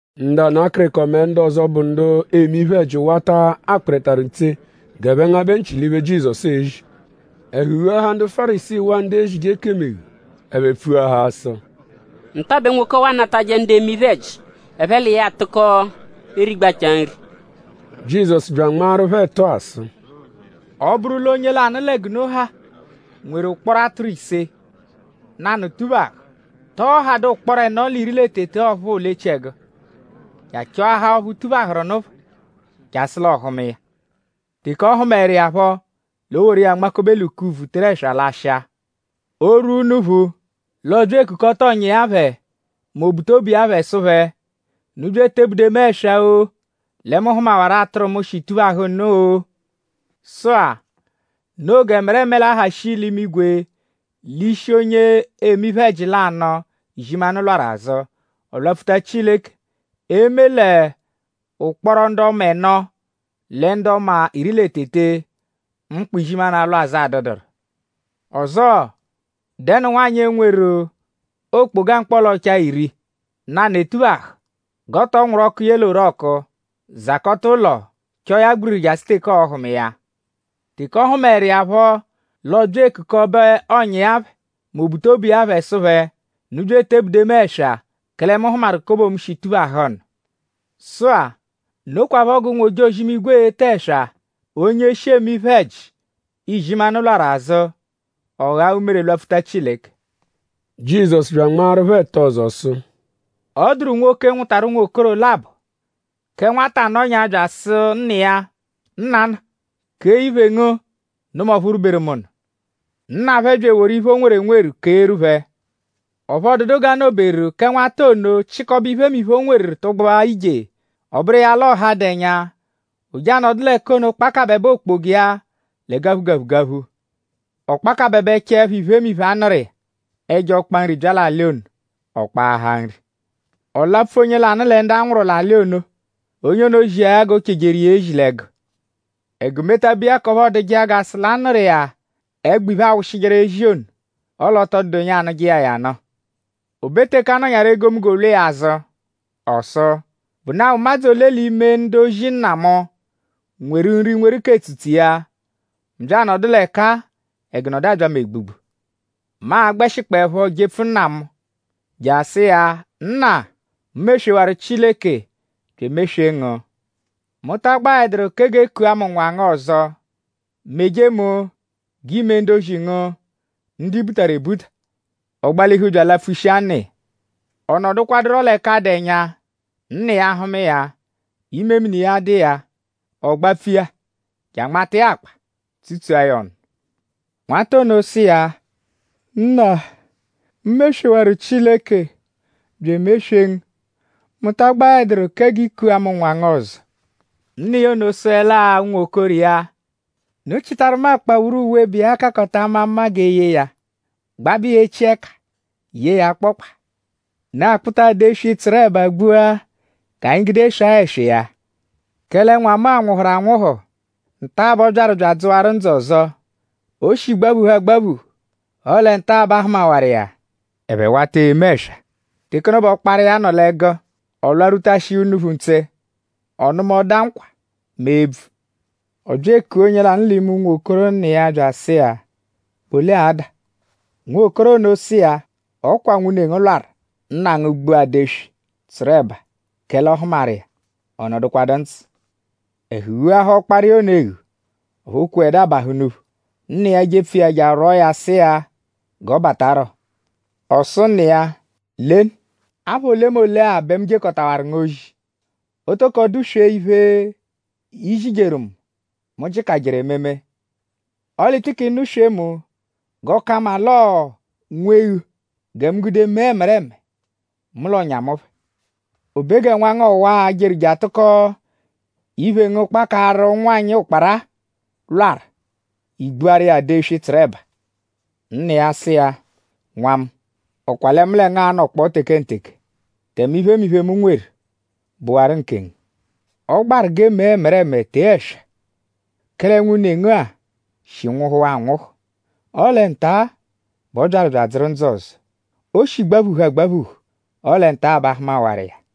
Ndu ana akịriko mẹ ndu ọzo, bụ ndu eme iphe-ẹji wata akpịritaru ntse g'ẹphe ngabẹ nchị l'iphe, Jizọsu ezi. Ẹhu ghuahaa ndu Fárisii waa ndu ezije ekemu eghu; ẹphe pfuahaa sụ: “Nta bẹ nwoke ọwa anatajẹ ndu eme iphe-ẹji; ẹphe l'iya atụko erigbachaa nri.” Jizọsu bya anmaaru phẹ ẹtu-a sụ: “Ọ -bụru l'onye lanụ lẹ g'unu ha nweru ụkporo atụru ise; nanụ -tuphahụ;?tọo hadụ ụkporo ẹno l'iri lẹ tete ọphuu l'echiẹgu; je achọahaa ọphu tuphahụru nụ phọ jasụ l'ọohuma iya?” Teke ọ hụmaeru iya phọ; l'o woru iya nmakobe l'ukuvu teru ẹswa lashịa. O -rwua unuphu; l'ọo-bya ekukọta ọ̀nyà iya phẹ mẹ obutobu iya phẹ sụ phẹ: “Unu bya etebude mu ẹswa-o; lẹ mu hụmawaru atụru mu, shi tuphahụ nụ-o.” Sụ-a; noo g'ẹmereme l'a-ha shii l'imigwe l'ishi onye eme iphe-ẹji lanụ, izimanụ lwarụ azụ; ọ lwapfuta Chileke; eme l'ụkporo ndu ọma ẹno lẹ ndu ọma iri lẹ tete, mkpa izimanụ alwa azụ adụduru. “Ọzoo?dẹnu nwanyị, e-nweru okpoga mkpọla-ọchaa iri; nanụ etuphahụ g'ọ tọ nwụru ọku ye l'orọku; zakọta ụlo; chọo ya gbiriri jasụ l'ọohuma iya. Teke ọ hụmaeru iya phọ l'ọ bya ekukọbe ọ̀nyà iya phẹ mẹ obutobu iya phẹ sụ phẹ: ‘Unu bya etebude mu ẹswa; kẹle mu hụmaru kobo mu, shi tuphahụ nụ.’ Sụ-a; nokwaphọ g'ụnwu-ojozi-imigwe e-te ẹswa onye shi eme iphe-ẹji, izimanụ lwarụ azụ; ọ ghaa umere lwapfuta Chileke.” Jizọsu bya anmaaru phẹ ẹtu ọzo sụ: Ọ dụru nwoke, nwụtaru unwokoro labọ. Kẹ nwata nọnyaa bya asụ nna iya: “Nnana; kee iphe ngu nụ mu ọphu rwuberu mu nụ.” Nna phẹ bya eworu iphe, o nweru enweru keeru phẹ. Ọphu ọ dụdu g'a nọ-beru; kẹ nwata ono chịkobe iphemiphe, o nweru tụgbua ije. Ọ bụru iya ala ọha, dụ ẹnya. O je anọdu l'ẹka ono kpakabẹbe okpoga iya lẹ gaphu-gaphu-gaphu. Ọ kpakabẹbechaepho iphemiphe, a nụru iya; ẹjo ọkpa nri bya l'alị ono; ọ kpaahaa nri. Ọ lapfu onye lanụ lẹ ndu a nwụru l'alị ono. Onye ono zia ya g'o chejeru iya ezi l'ẹgu. Ẹgu metabe iya k'ọphu ọoduje iya g'a sụ l'a nụru iya ẹgbo iphe, aawụshijeru ezi ono; ọle ọ tọ dụdu onye anụje iya ya nụ. O be teke a nọnyaru egomunggo lwa iya azụ. Ọ sụ: “?Bụnaa ụmadzu ole l'ime ndu-ozi nna mu nweru nri nweru k'etsutsu iya; mu bya anọdu l'ẹka-a; ẹgu nọdu abya mu egbugbu? Mu a-gbẹshikpoepho jepfu nna mu je asụ iya: ‘Nna; mu meswewaru Chileke bya emeswee ngu. Mu ta agbaẹduru kẹ g'e kua mu nwa ngu ọzo. Meje mu g'iime ndu-ozi ngu ndu i butaru ebuta.’ Ọ gbalihu bya alapfushia nna iya. “Ọ nọdukwaduro l'ẹka dụ ẹnya; nna iya hụma iya; imemini iya dụ iya. Ọ gbapfu iya je anmata iya akpa; tsutsua ya ọnu. Nwata ono sụ iya: ‘Nna; mu meswewaru Chileke bya emeswee ngu. Mu ta agbaẹduru kẹ g'i kua mu nwa ngu ọzo.’ Nna iya ono sụele-a unwokoro iya: ‘Unu chịtaru mu akpawuru uwe, bụ iya kakọta ama mma g'e yee ya; gbabẹ iya echi ẹka; yee ya akpọkpa. Unu akpụta adeswi, tsụru ẹba gbua g'anyi gude swaa ẹswa iya. Kẹle nwa mu-a nwụhuru anwụhu; nta-a bẹ ọ byaru bya adzụwaru ndzụ ọzo. O shi gbaphuhu agbaphuhu; ọle nta-a bẹ a hụmawaru iya.’ Ẹphe wata eme ẹswa. “Teke ono bẹ ọkpara iya nọ l'ẹgu. Ọ lwarwutashia unuphu ntse; ọ nụma ọda nkwa mẹ ebvu. Ọ bya ekua onye lanụ l'ime unwokoro nna iya bya asụ iya: ‘?Bụ ole ada?’ Nwokoro ono sụ iya: ‘Ọ kwa nwune ngu lwarụ; nna ngu gbua ada-eswi, tsụru ẹba; kẹle ọ hụmaru iya; ọ nọdukwadu ndzụ.’ Ẹhu ghuahaa ọkpara iya ono eghu. Ọphu o kweẹdu abahụ unuphu. Nna iya jepfu iya je arwọo ya sụ iya g'ọ batarọ. Ọ sụ nna iya: ‘Lenu! Apha olemole-a bẹ mu jekọtawaru ngu ozi. O toko dụ-swe iphe, i zijeru mu, mu jịkajeru ememe. Ọle i tikị nụ-swee mu g'ọ ka mma l'ọo nwa-eghu gẹ mu gude mee ẹmereme mu l'ọ̀nyà mu phẹ. O be gẹ nwa ngu ọwa-a, jeru je atụko iphe ngu kpakaaru ụnwanyi ụkpara-a lwarụ; i gbuaru iya ada-eswi, tsụru ẹba.’ Nna iya sụ iya: ‘Nwa mu;?Ọ kwa lẹ mu lẹ ngu anọkpoo tekenteke; tẹme iphemiphe, mu nweru bụwaru nkengu. Ọ gbaru g'e mee ẹmereme tee ẹswa; kẹle nwune ngu-a shi nwụhuwaa anwụhu; ọle nta-a bẹ ọ byaru bya adzụru ndzụ ọzo. O shi gbaphuhu agbaphuhu; ọle nta-a bẹ a hụmawaru iya.’”